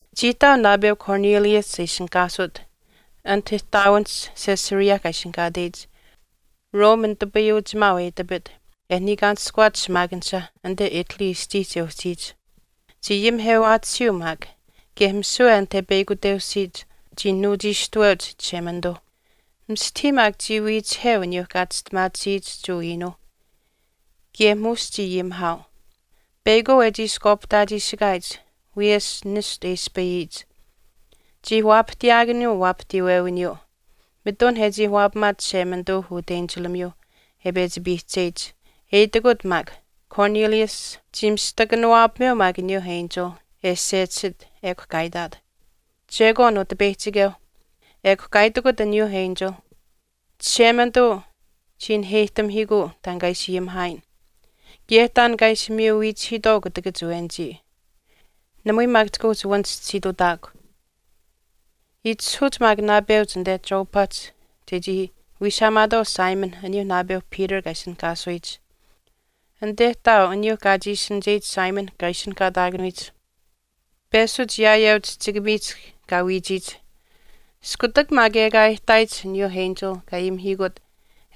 Chii ihtaau naapeu Cornelius e ishinihkaasut anit ihtaawinihch Caesarea kaa ishinihkaateyich, Rome nitupayuuchimaau e itapit e niikaanishkuwaat shimaakanisha anite Italy aschiihch e uhchiyich. Chii ayimihewaatisiyuu maak kaye misiwe anit e peyakuteusiit chii nuuchiishtuweuch Chishemanituu. Mistahii maak chii wiichiheu aniyuu kaa chistimaatisiyich Jewa iinuu. Kaye muush chii ayimihaau. Peyakwaau e chiishkwaapihtaachiishikaayich wiyesh nishtu e ispayiyich, chii waapahtiyaakanuu waapahtiiwewiniyuu, mitun e chii waapamaat Chishemanituu utenchilamiyuu e pechi piihcheyich, e itikut maak, “Cornelius.” Chii mistakanuwaapameu maak aniyuu enchil e sechisit ekw kaa itaat, “Chekwaan, Utipeyihchikeu.” Ekw kaa itikut aniyuu enchil, “Chishemanituu chii naheyihtamihiikuu taan kaa ishi ayimihaayin, kaye taan kaa ishi miyu wiichihiitwaau kutakach awenichii, namui maak chika uhchi wanchischisiitutaakw. Itishahuuch maak naapeuch anite Joppahch chechii wiishaamaatwaau Simon aniyuu naapeu Peter kaa ishinihkaataakanuyich. Anite ihtaau aniyuu kaa chiishinicheyich Simon kaa ishinihkaasuyich peshuch yaayeu chihchikamiihch kaa wiichiyich.” Iskutak maak ekaa e ihtaayich aniyuu enchil kaa ayimihiikut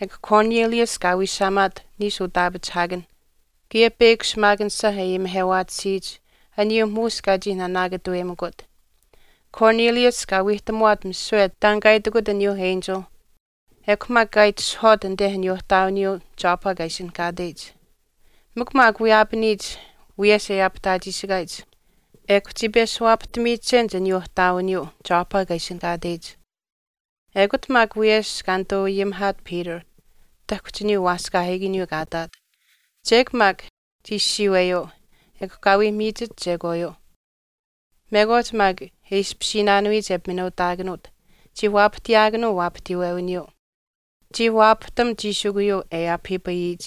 ekw Cornelius kaa wiishaamaat niishu utaapachihaakan, kaye peyakw shimaakanisha e ayimihewaatisiyich aniyuu muush kaa chii naanaakatuweyimikut. Cornelius kaa wiihtamuwaat misiwe taan kaa itikut aniyuu enchil ekw maak kaa itishahwaat anite aniyuu ihtaawiniyuu Joppa kaa ishinihkaateyich. Miin maak wiyaapaniyich wiyesh e aapihtaachiishikaayich ekw chii peshuwaapahtamiyichenich aniyuu ihtaawiniyuu Joppa kaa ishinihkaateyich. Ekut maak wiyesh kaa nituu ayimihaat Peter tahkuhch aniyuu waaskaahiikaniyuu kaa ihtaat. Chek maak chii siiweyuu ekw kaa wii miichit chekwaayuu, mekwaach maak e ishpishiinaanuyich e piminuutaakanuut chii waapahtiyaakanuu waapahtiiwewiniyuu. Chii waapahtam chiishikuyuu e aapahiipayiyich,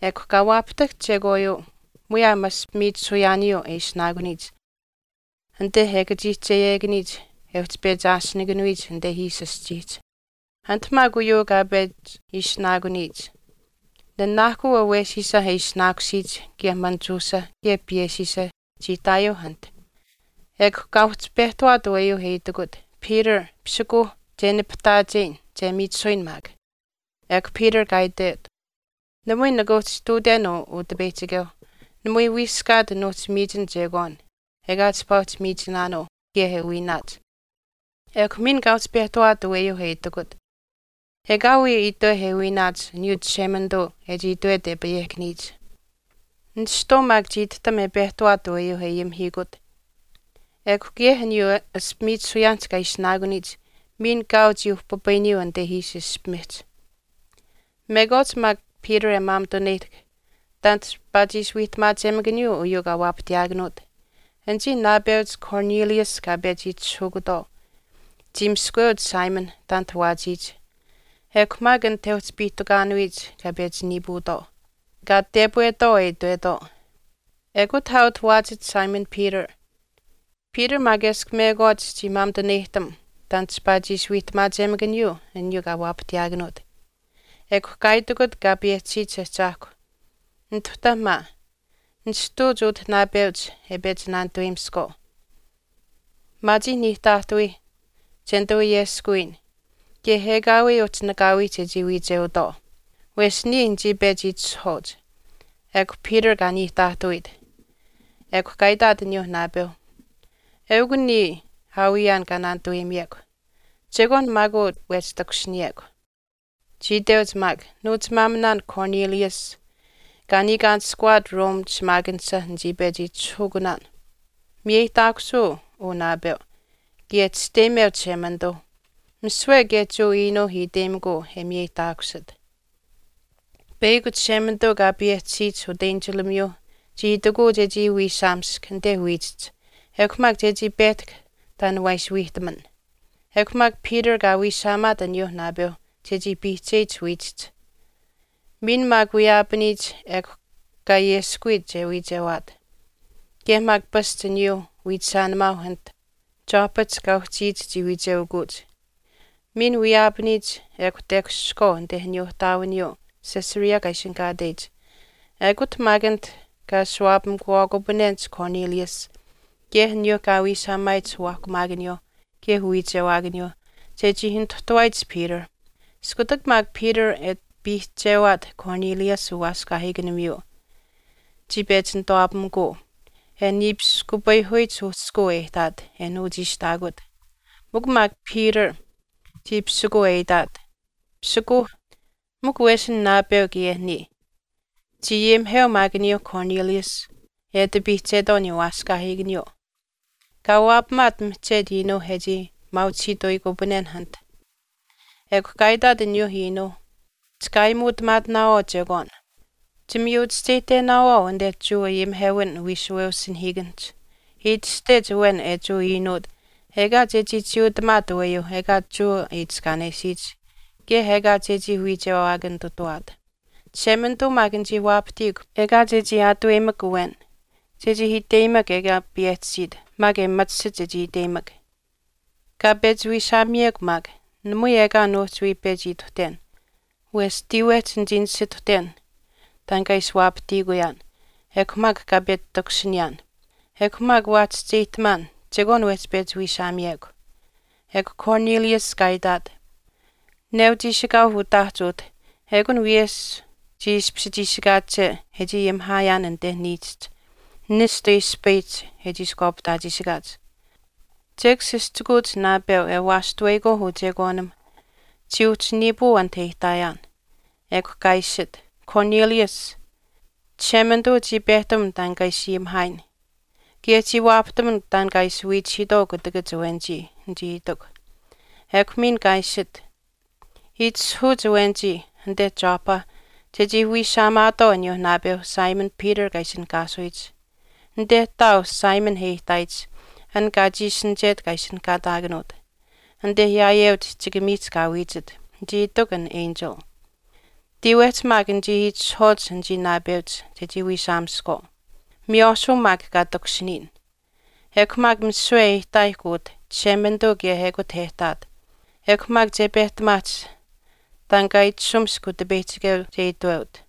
ekw kaa waapahtahk chekwaayuu muyaam ashpimiichisuyaaniyuu e ishinaakuniyich anite e kachiihcheyekaniyich e uhchi pechi aashinikanuyich anite ishi aschiihch. Anit maak uyuu kaa pechi aashinikanuyich nanaahkuu awesiisa e ishinaakusiyich kaye manichuusha kaye piyeshiisha chii ihtaayuuh anit. Ekw kaa uhchi pehtawaat aweyuu e itikut, “Peter, pisikuuh, che nipahtaacheyin, che miichisuyin maak.” Ekw Peter kaa itwet, “Namui nika uhchi ihtuuten uu Utipeyihchikeu. Namui wiiskaat nuuhchi miichin chekwaan ekaa chipaa uhchi miichinaanuu kaye e wiinaach.” Ekw miin kaa uhchi pehtawaat aweyuu e itikut, “Ekaawii itweh e wiinaach aniyuu Chishemanituu e chii itwet e payehkaniyich.” Nishtwaau maak chii itihtam e pehtawaat aweyuu e ayimihiikut ekw kaye aniyuu ashpimiichisuyaanihch kaa ishinaakuniyich miin kaau chii uhpipayiniyuu anite ishi ishpimihch. Mekwaach maak Peter e maamituneyihtahk taan chipaa chii ishi wiihtamaachemakaniyich uyuu kaa waapahtiyaakanuut, anichii naapeuch Cornelius kaa pechi itishahukutwaau chii miskamuweuch Simon taanit waachiyich ekw maak anit e uhchi piihtukaanuyich kaa pechi niipuutwaau, kaa tepwetwaau e itwetwaau, “Ekut aa utah waachit Simon Peter.” Peter maak eshkw mekwaach chii maamituneyihtam taan chipaa chii ishi wiihtamaachemakaniyich aniyuu kaa waapahtiyaakanuut. Ekw kaa itikut Kaa payehchisiyich Ahchaahkwa, “Nituhta maa, nishtuuch utah naapeuch e pechi naanituweyimiskwaau. Maachiih niihtaahtawiih che nituu ayeskuwiyin, kaye ekaawii uhchi nakaawii chechii wiicheutwaau. Wesh niya nichii pechi itishahwaauch.” Ekw Peter kaa niihtaahtawiit, ekw kaa itaat aniyuu naapeuh, “Eukw niya aawiyaan kaa naanituwaapamiyekw. Chekwaan maak uu wehch takushiniyekw.” Chii iteuch maak, “Nuuchimaaminaan Cornelius kaa niikaanishkuwaat Rome shimaakanisha nichii pechi itishahukunaan. Miyeyihtaakusuu uu naapeu, kaye chisteyimeu Chishemanituu, misiwe kaye Jewa iinuuh iteyimikuu e miyeyihtaakusit. Peyakw Chishemanituu kaa payehchisiyich utenchilamiyuu chii itikuu chechii wiishaamisk anite wiichihch ekw maak chechii pehtahk taan waa ishi wiihtaman.” Ekw maak Peter kaa wiishaamaat aniyuu naapeuh chechii piihcheyich wiichihch. Miin maak wiyaapaniyich ekw kaa ayeskuwiit che wiichewaat, kaye maak pasch aniyuu wiichishaanimaauh anit Joppahch kaa uhchiyich chii wiicheukuuch. Miin wiyaapaniyich ekw kaa takushihkwaau anite aniyuu ihtaawiniyuu Caesarea kaa ishinihkaateyich, ekut maak anit kaa ashuwaapamikuwaakupanenich Cornelius kaye aniyuu kaa wiishaamaayich uwaahkumaakaniyuu kaye uwiichewaakaniyuu chechii nituhtuwaayich Peter. Iskutak maak Peter e ati piihchewaat Cornelius uwaaskaahiikanimiyuu chii pechi nituwaapamikuu, e niipiskuupayihuyich uhchishkuu e ihtaat e nuuchiishtaakut. Mikw maak Peter chii pisikuuneu e itaat, “Pisikuuh, mikw wesin naapeu kaye niya.” Chii ayimiheu maak aniyuu Cornelius e ati piihchetwaau aniyuu waaskaahiikaniyuu. Kaa waapamaat mihchetu iinuu e chii maauchihiituyikupananen anit. Ekw kaa itaat aniyuu iinuu, “Chika aayimuutamaatinaawaau chekwaan. Chimiyuchischeyihtenaawaau anite Jewa ayimihewin wiishuweusinahiikanihch e itashtech awen e Jewa iinuut ekaa chechii chiiutamaat aweyuu ekaa Jewa itiskaanesiyich kaye ekaa chechii wiichewaakanitutawaat. Chishemanituu maak nichii waapahtiikw ekaa chechii aataweyimak awen, chechii iteyimak ekaa payehchisiit maak e machisit chechii iteyimak. Kaa pechi wiishaamiyekw maak, namui ekaa nuuhchi wii pechi ituhten wesh tiiwehch nichii nisituhten taan kaa ishi waapatiikuyaan ekw maak kaa pechi takushiniyaan. Ekw maak waa chischeyihtamaan, chekwaan wehchi pechi wiishaamiyekw.” Ekw Cornelius kaa itaat, “Neu chiishikaau utaahch utah ekun wiyesh chii ishpish chiishikaache e chii ayimihaayaan anite niichihch nishtu e ispayihch e chiishkwaapihtaachiishikaach. Chek sischikuuch naapeu e waashtuweyikwaau uchekwaanim chii uhchi niipuu anit e ihtaayaan. Ekw kaa iishit, ‘Cornelius, Chishemanituu chii pehtam taan kaa ishi ayimihaayin kaye chii waapahtam taan kaa ishi wiichihiitwaau kutakach awenichii,’ nichii itikw. Ekw miin kaa iishit, ‘itishahuuch awenichii anite Joppa chechii wiishaamaatwaau aniyuu naapeu Simon Peter kaa ishinihkaasuyich. Anite ihtaau Simon e ihtaayich an kaa chiishinichet kaa ishinihkaataakanuut, anite yaayeu chihchikamiihch kaa wiichit,’ nichii itikw an enchil. Tiiwehch maak nichii itishahwaauch anichii naapeuch chechii wiishaamiskwaau, miywaashuu maak kaa takushiniyin. Ekw maak misiwe e ihtaayihkw utah, Chishemanituu kaye ekut e ihtaat, ekw maak che pehtamaahch taan kaa itashumisk Utipeyihchikeu che itweut.”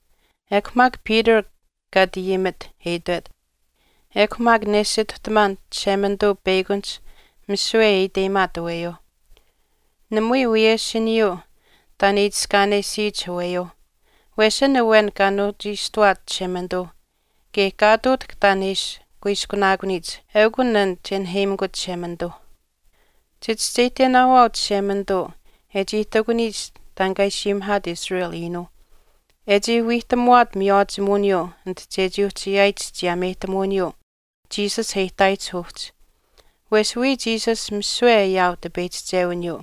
Ekw maak Peter kaa ati ayimit, e itwet, “Ekw maak nesituhtamaan Chishemanituu peyakunihch misiwe e iteyimaat aweyuuh. Namui wiyeshiniyuu taan e itiskaanesiyich aweyuu. Wesh an awen kaa nuuchiishtuwaat Chishemanituu kaye kaa ihtuutahk taan e ishi kuiskunaakuniyich eukw an che naheyimikut Chishemanituu. Chichischeyihtenaawaau Chishemanituu e chii ihtakuniyich taan kaa ishi ayimihaat Israel iinuuh, e chii wiihtamuwaat miywaachimuwiniyuu anit chechii uhchi ayaayich chiyaameyihtamuwiniyuu Jesus e ihtaayich uhchi. Wesh wiya Jesus misiwe ayaau tipeyihchichewiniyuu.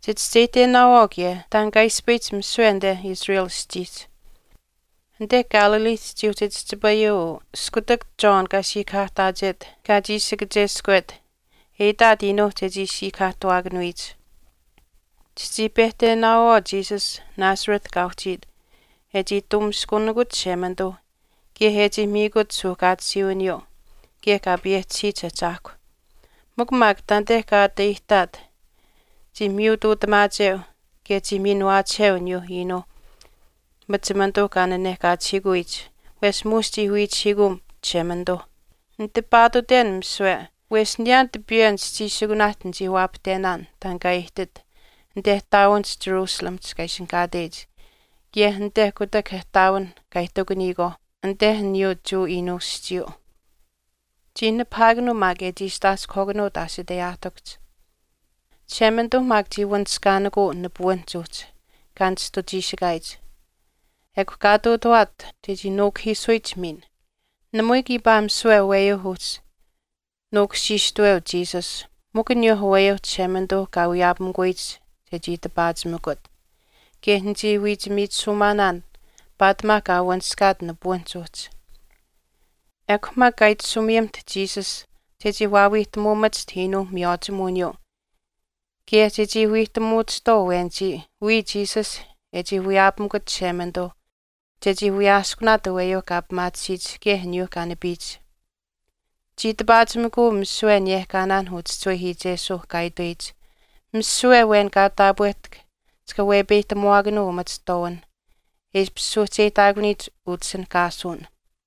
Chichischeyihtenaawaau kaye taan kaa ispayihch misiwe anite Israel aschiihch. Anite Galileehch chii uhchi chihchipayuu uu iskutak John kaa siikahaahtaachet kaa chiishi kacheskwet e itaat iinuuh chechii siikahaahtuwaakanuyich. Chichii pehtenaawaau Jesus Nazareth kaa uhchiit e chii tuumiskunikut Chishemanituu kaye e chii miikut suuhkaatisiiwiniyuu kaye Kaa payehchisiyich Ahchaahkwa. Mikw maak taanite kaa ati aihtaat chii miyutuutamaacheu kaye chii miinuwaachiheu aniyuu iinuu machimanituu kaa nanehkaachihiikuyich wesh muush chii wiicheukuu Chishemanituu. Nitipaatutenaan misiwe wesh niyaan tipiyeu nischiishikunaahch nichii waapahtenaan taan kaa ihtit anite ihtaawinihch Jerusalem kaa ishinihkaatech kaye anite kutak ihtaawinh kaa ihtakuniyikwaauh anite aniyuu Jewa iinuu aschiiyuu. Chii nipahaakanuu maak e chiistaaskuhwaakanuut aashiteyaahtikuhch. Chishemanituu maak chii wanishkaanikuu nipuwinihch uhchi kaa nishtuchiishikaayich, ekw kaa ihtuutawaat chechii nuukuhiisuyich miin. Namui kiipaa misiwe aweyuuh uhchi nuukushiishtaweu Jesus, mikw aniyuuh aweyuuh Chishemanituuh kaa wiyaapamikuyich chechii tipaachimikut. Kaye nichii wiichimiichisuumaanaan paatimaa kaa wanishkaat nipuwinihch uhchi. Ekw maak kaa itashumiyimiht Jesus chechii waawiihtamuumachiht iinuuh miywaachimuwiniyuu kaye chechii wiihtamuuchihtwaau awenichii wiya Jesus e chii wiyaapamikut Chishemanituu chechii wiyaaskunaat aweyuu kaa pimaatisiyich kaye aniyuu kaa nipiyich. Chii tipaachimikuu misiwe aniyehkaanaan uchischiwehiichesuuh kaa itweyich, ‘misiwe awen kaa taapwehtahk chika wepeyihtamuwaakanuu umachihtwaawinh e ishpish suuhcheyihtaakuniyich utishinihkaasuwin.’”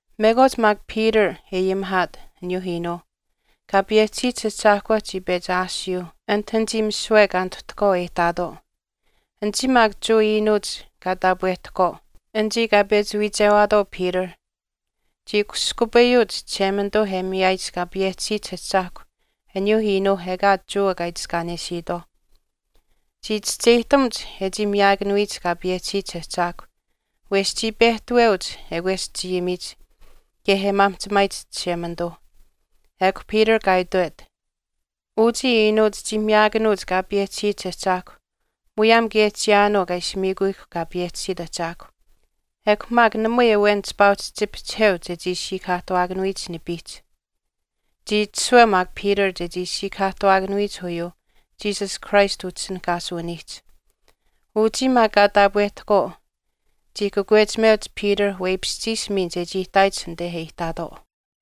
Mekwaach maak Peter e ayimihaat aniyuu iinuuh, Kaa payehchisiyich Ahchaahkwa chii pechi aashiyuu anit anichii misiwe kaa nituhtahkwaau e ihtaatwaau. Anichii maak Jewa iinuuch kaa taapwehtahkwaau, anichii kaa pechi wiichewaatwaau Peter, chii kushkupayuuch Chishemanituu e miyaayich Kaa payehchisiyich Ahchaahkwa aniyuu iinuuh ekaa Jewa kaa itiskaanesiitwaauh. Chii chischeyihtamuch e chii miyaakanuyich kaa payehchisiyich ahchaahkwa, wesh chii pehtaweuch e kweschayimiyich kaye e maamihchimaayich Chishemanituu. Ekw Peter kaa itwet, “Uchii iinuuch chii miyaakanuuch Kaa payehchisiyich Ahchaahkwa muyaam kaye chiyaanuu kaa ishi miikuyihkw kaa payehchisiit ahchaahkw. Ekw maak namui awen chipaa uhchi chipihchiheu chechii siikahaahtuwaakanuyich nipiihch.” Chii itashuweu maak Peter chechii siikahaahtuwaakanuyich uyuuh Jesus Christ utishinihkaasuwiniihch. Uchii maak kaa taapwehtahkwaau chii kakwechimeuch Peter weipishchiish miin chechii ihtaayich anite e ihtaatwaau.